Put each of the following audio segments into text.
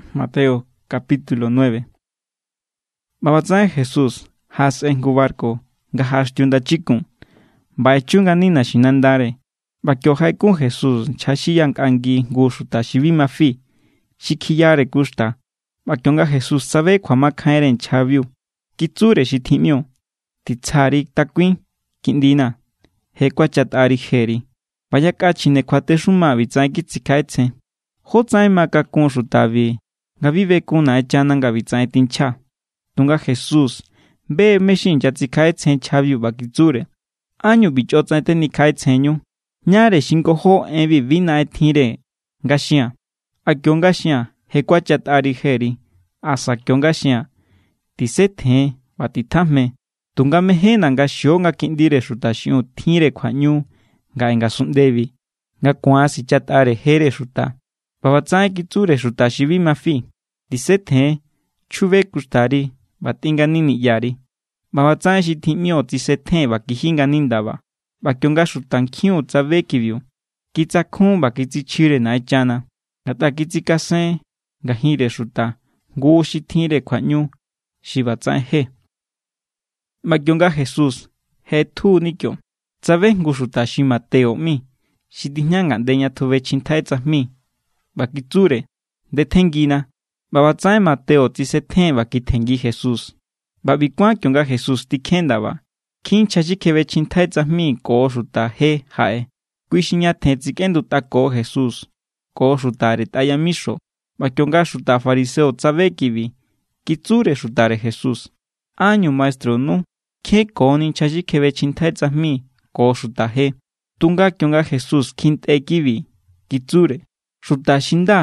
ꞌBa ꞌbatsaꞌen Jesús jaꞌasꞌen jngu barku nga jaꞌaxtiu ndachikun, ꞌba echu ngani naxinandare. ꞌBa kio jaꞌekun Jesús nchja xi yaꞌankꞌangi jngu xuta xi bi ma fi, xi kjiyare kuxta. ꞌBa kionga Jesús tsabe kjuamakjainre nchjabiu, kitsure xi tjiꞌmio: —Titsja_ri takuin, kiꞌndina̱. Je kuachatꞌari jeri. ꞌBa yakꞌa chjine kjuatexuma ꞌbitsaꞌen kitsikjaꞌetsjen: “¿Jótsaꞌen ma kakun xutabi nga bi bekun Naꞌenchana nga ꞌbitsaꞌen tinchja?” Tunga Jesús be= mé= xi inyatsikjaꞌetsjen nchjabiu ꞌba kitsure: —¿Ánñu ꞌbi chꞌo tsaꞌen tenikjaꞌetsjenñu? ¿Ñáre xi ngojó enbi bi naꞌen tjinre nga xia̱n? ¿A kio=nga xia̱n: “Je kuachatꞌari jeri”? ¿Asa kio=nga xia̱n: “Tisetjen ꞌba titjajme”? Tunga mejénna̱ nga xio nga Kiꞌndire Xuta xiꞌiun tjinre kjuaꞌñu ngaꞌe ngasunꞌndebi, nga ku̱an sichatꞌare jere xuta. ꞌBa ꞌbatsaꞌen kitsure xuta xi bi ma fi: —Tisetjen, chjube kuxtari ꞌba tꞌin ngani niꞌyari. ꞌBa ꞌbatsaꞌen xi tjiꞌmio tsisetjen ꞌba kiji ngani ndaba. ꞌBa kionga xutankjiun tsabe kibiu, kitsakjun ꞌba kitsichjire Naꞌenchana, ngatꞌa kitsikasen ngajinre xuta jngu xi tjinre kjuaꞌñu xi ꞌbatsaꞌen je. ꞌBa kionga Jesús je ꞌetjuni kio, tsabe jngu xuta xi Mateo ꞌmi, xi tijña ngaꞌnde ña tjubechjintjai tsajmi, ꞌba kitsure: —Ndetjenngina. ꞌBa ꞌbatsaꞌen Mateo tsisetjen ꞌba kitjenngi Jesús. ꞌBa ꞌbi kuán kionga Jesús tikjen ndaba, nkjin nchja xi kjebechjintjai tsajmi ko xuta je jaꞌe. Kui xi ñatjen tsikꞌendutꞌako Jesús ko xutare tꞌa yamixo. ꞌBa kionga xuta fariseo tsabe kibi, kitsure xutare Jesús: —¿Ánñu maestrunu kjenkoni nchja xi kjebechjintjai tsajmi ko xuta je? Tunga kionga Jesús kjintꞌe kibi, kitsure: —Xuta xi nda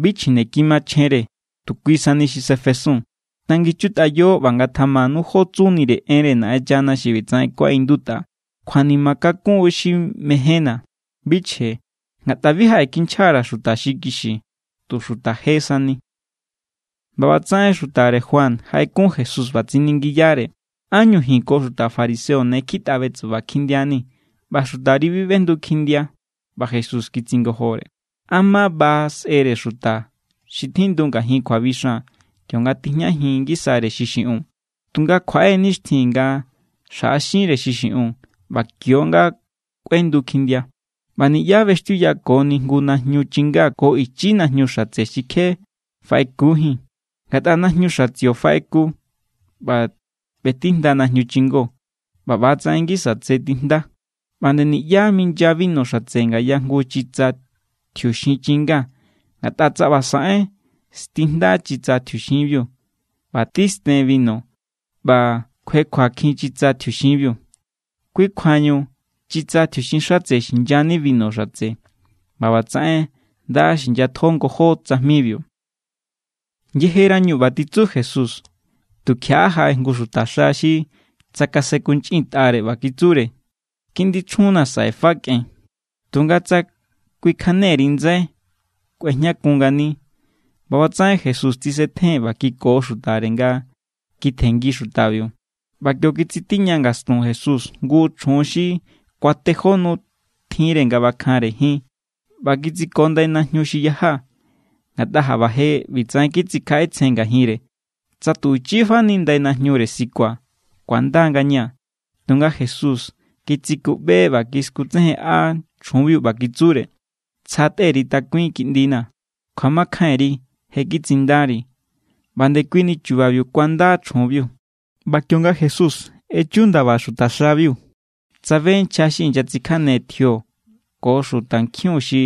bi chjineki machjenre, tu kui sani xi sefesun. Tanginchutꞌayo ꞌba ngatjamanu jó tsunire enre Naꞌenchana xi ꞌbitsaꞌen kuaꞌindutꞌa: “Kjuanima kakun xi mejénna̱, bi chje.” Ngatꞌa bi jaꞌekinchja_ra̱ xuta xi kixi, tu xuta je sani. ꞌBa ꞌbatsaꞌen xutare Juan jaꞌekun Jesús ꞌba tsiningiyare: —¿Ánñu ji̱n ko xuta fariseo ne kjitꞌa betsuba kjindiani̱ ꞌba xutari bi ꞌbendu kjindia? ꞌBa Jesús kitsingojore: —¿A ma ba sꞌere xuta xi tjindu ngajin kjuabixan kionga tijñajin ngisare xi xiꞌiun? Tunga kjuaꞌe nixtjin nga xjaꞌaxinre xi xiꞌiun, ꞌba kio=nga kꞌuendu kjindia. ’ꞌBa niꞌyá ꞌbextiuyakoni jngu najñu chingá ko ichi najñu xatse xi kje faꞌekujín. Ngatꞌa najñu xatsio faꞌeku ꞌba ꞌbetijnda najñu chingó, ꞌba ꞌba=tsaꞌen ngisa tse tijnda. ꞌBa nde niꞌyá minya binu xatse ngaya jngu chitsa tjiuxin chinga. Ngatꞌa tsa ꞌba saꞌen, stijnda= chitsa tjiuxinbiu ꞌba tisten binu ꞌba kjuekjuakjin chitsa tjiuxinbiu. Kui kjuañu chitsa tjiuxin xatse xinyani binu xatse, ꞌba ꞌbatsaꞌen nda xinyatjo ngojó tsajmibiu. Yejerañu ꞌba titsu Jesús, tukjiaꞌa jaꞌe jngu xutaxa xi tsakasenkunchꞌintꞌare ꞌba kitsure: —Kiꞌndi chjunna̱ saꞌe fa kꞌen. Tunga tsa kꞌuikjane_ri ndsai, kꞌuejñakun ngani. ꞌBa ꞌbatsaꞌen Jesús tsisetjen ꞌba kiko xutare nga kitjenngi xutabiu. ꞌBa kio= kitsitiña ngastun Jesús jngu chjun xi kuatejó nu tjinre nga ꞌbakjanre jin ꞌba kitsiko ndai najñu xi yaja. Ngatꞌa jaꞌba je ꞌbitsaꞌen kitsikjaꞌetsjen ngajinre: “Tsa tu ichifani ndai najñure sikua̱, ku̱anda=ngaña̱.” Tunga Jesús kitsikuꞌbe ꞌba kiskutsejenꞌa chjunbiu ꞌba kitsure: —Tsja tꞌe_ri takuin, kiꞌndina̱. Kjuamakjainri je kitsindari. ꞌBa ndekuini chubabiu kuanda chjunbiu. ꞌBa kionga Jesús echu ndaba xutaxabiu, tsabe nchja xi inyatsikjane tjio ko xutankjiun xi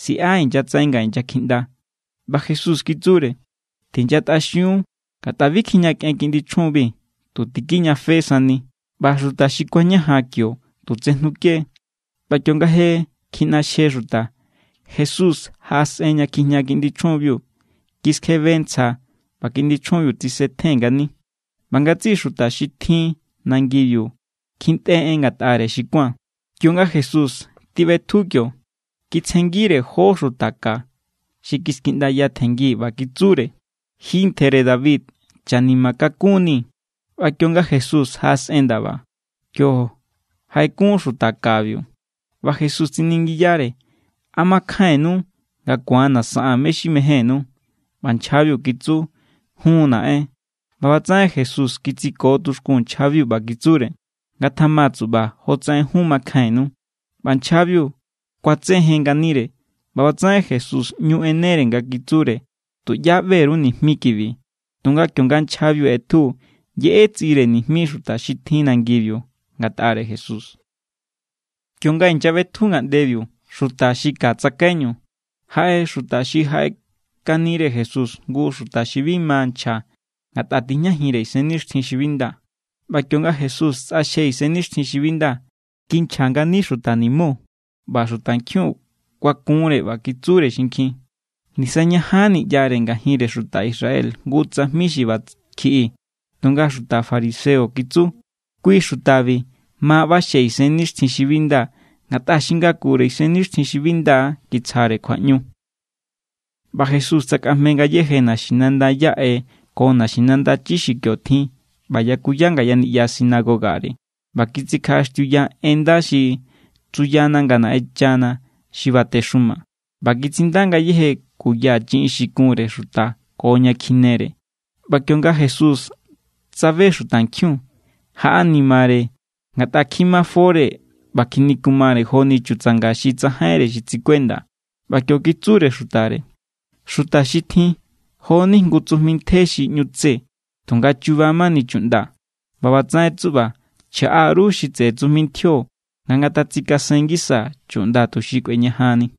siꞌa inyatsaꞌen nga inyakjiꞌnda. ꞌBa Jesús kitsure: —Tinyatꞌaxiun. Ngatꞌa bi kijñakꞌen kiꞌndi chjunbi. Tu tikijñafe sani. ꞌBa xuta xi kuañajan kio tu tsejnuke=. ꞌBa kionga je kjiꞌnaxje xuta, Jesús jaꞌasꞌen ña kjijña kiꞌndi chjunbiu. Kiskjebe ntsja ꞌba kiꞌndi chjunbiu tsisetjen ngani. ꞌBa ngatsiꞌi xuta xi tjin nangibiu kjintꞌe en ngatꞌare xi kuán. Kionga Jesús tiꞌbetju kio, kitsjenngire jó xuta ka xi kiskjiꞌndaya tjenngi ꞌba kitsure: —Ji ntjere David, chanima kakunni̱. ꞌBa kionga Jesús jaꞌasꞌen ndaba, kio jaꞌekun xuta kabiu. ꞌBa Jesús tsiningiyare: —¿A makjainnu nga ku̱anna̱ saꞌaa̱n mé= xi mejénnú? ꞌBa nchjabiu kitsu: —Jun, naꞌen. ꞌBa ꞌbatsaꞌen Jesús kitsiko tuxkun nchjabiu ꞌba kitsure: —Ngatjama tsuꞌba jotsaꞌen jun makjainnu. ꞌBa nchjabiu kuatsejen nganire. ꞌBa ꞌbatsaꞌen Jesús ꞌñu ꞌenere nga kitsure: —Tuꞌyá ꞌbe_ru nijmi kibi. Tunga kionga nchjabiu ꞌetju, yeꞌe tsiꞌire nijmi xuta xi tjin nangibiu ngatꞌare Jesús. Kionga inyaꞌbetju ngaꞌndebiu xuta xi ka tsakaiñu, jaꞌe xuta xi jaꞌekanire Jesús jngu xuta xi bi ma nchja ngatꞌa tijñajinre isennixtjin xi bi nda. ꞌBa kionga Jesús tsꞌaxje isennixtjin xi bi nda, kinchja ngani xuta nimo. ꞌBa xutankjiun kuakunre ꞌba kitsure xinkjin: —Nisañajanni ꞌyare ngajinre xuta Israel jngu tsajmi xi ꞌba kjiꞌi. Tunga xuta fariseo kitsu: —Kui xutabi ma ꞌbaxje isennixtjin xi bi nda ngatꞌa xi ngakure isennixtjin xi bi nda kitsjare kjuaꞌñu. ꞌBa Jesús tsakꞌajme ngayéje naxinanda yaꞌe ko naxinanda chi xi kio tjin ꞌba yakuya ngaya niꞌya sinagogare. ꞌBa kitsikjaꞌaxtiuya en nda xi tsuyana nga Naꞌenchana xi batexuma, ꞌba kitsinda ngayéje kuya chiꞌin xi kunre xuta ko ña kjinere. ꞌBa kionga Jesús tsabe xutankjiun, jaꞌanimare, ngatꞌa kjimafore ꞌba kjinikumare joni chutsanga xi tsajainre xi tsikuenda. ꞌBa kio kitsure xutare: —Xuta xi tjin, jo=ni jngu tsujmi ntje xi ꞌñu tse, tunga chuba mani chuꞌnda. ꞌBa ꞌbatsaꞌen tsuꞌba chjaꞌa_ru xi tseꞌe tsujmintjio, nga ngatatsikasen ngisa chuꞌnda tuxi kꞌueñajanni.